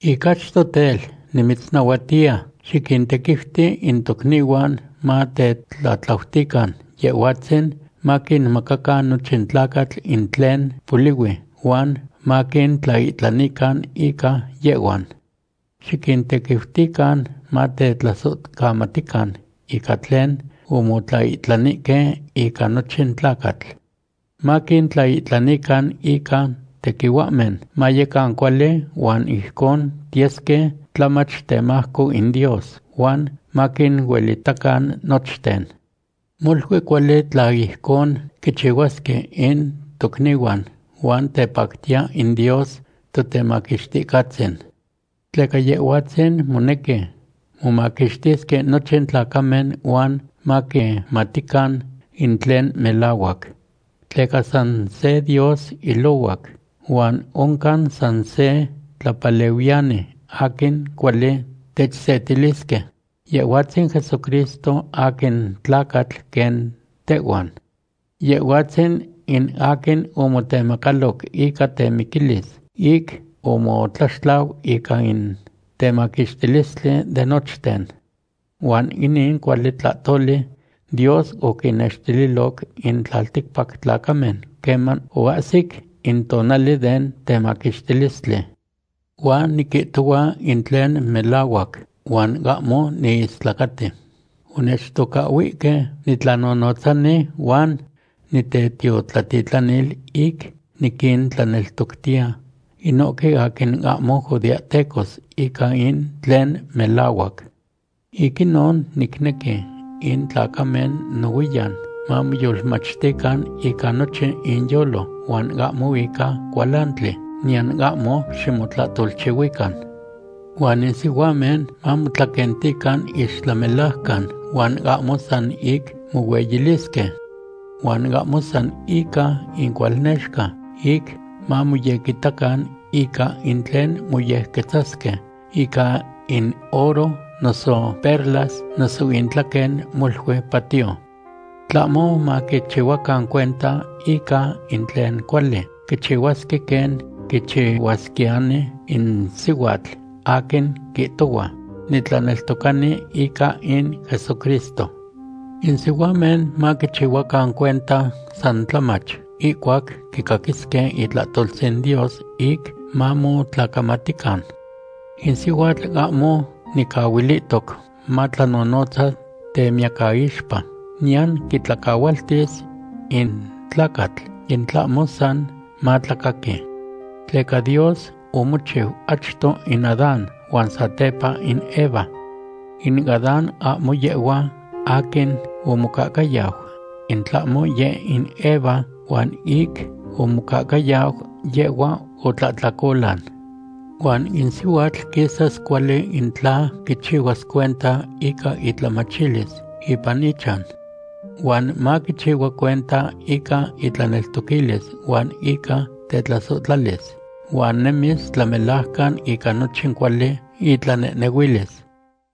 Ic achto tel, nimitznahuatiya, xiquintequiuti in tocnihuan matetlatlautican Yehhuatzin maquinmacacan nochin tlacatl in tlen polihui huan maquintlaihtlanican ica yehhuan. Xiquintequiutican matetlasohcamatican ica tlen omotlaihtlanihque ica nochin tlacatl. Maquintlaihtlanican ica tequihuahmen mayecan cuali huan ijcon tiyesque tlamach, temajco in Dios, huan maquinuelitacan nochten. Molui cuali tla ijcon quichihuasque in tocnihuan huan tepactiya in Dios Totemaquixticahtzin. Tleca Yehhuatzin monequi momaquixtisque nochin tlacamen huan maquimatican in tlen melahuac. Tleca san se Dios ilohuac huan oncan san se tlapalehuiyani aquin cuali techsetilisque, Yehhuatzin Jesucristo aquin tlacatl quen tehhuan. Yehhuatzin in aquin omotemacaloc ica temiquilis ic omotlaxtlau ica in temaquixtilistli de nochten. Huan inin cuali tlahtoli Dios oquinnextililoc in tlalticpac tlacamen queman oahsic in tonali den temaquixtilistli. Huan niquihtohua in tlen melahuac huan ahmo niistlacati. Onechtocahhuihque nitlanonotzani huan nitetiotlatitlanil ic niquintlaneltoctiya inohque aquin ahmo judeahtecos ica in tlen melahuac. Ic inon nicnequi in tlacamen nohuiyan mamoyolmachtican ica nochin inyolo, huan ahmo ica cualantli, niyan ahmo ximotlahtolchihuican. Huan in sihuamen mamotlaquentican ixtlamelajcan huan ahmo san ic mohueyilisque. Huan ahmo san ica incualnexca ic mamoyequitacan ica in tlen moyequetzasque ica in oro noso perlas noso intlaquen molui patio. Tlahmo maquichihuacan cuenta ica in tlen cuali quichihuasque quen quichihuasquiyani in sihuatl aquin quihtohua: “Nitlaneltocani ica in Jesucristo.” In sihuamen maquichihuacan cuenta san tlamach ihcuac quicaquisque itlahtoltzin Dios ic mamotlacamatican. In sihuatl ahmo nicahualihtoc matlanonotzas temiyacaixpa, niyan quitlacahualtis in tlacatl, in tlahmo san matlacaqui. Tleca Dios omochiu achto in Adán huan satepa in Eva. In Adán, ahmo yehhua aquin omocahcayau, in tlahmo yeh in Eva, huan ic omocahcayau yehhua, otlahtlacolan. Huan in sihuatl quisas cuali in tla quichihuas cuenta ica itlamachilis ipan ichan. Huan maquichihua cuenta ica itlaneltoquilis huan ica tetlasohtlalis huan nemis tlamelajcan ica nochin cuali itlanehnehuilis.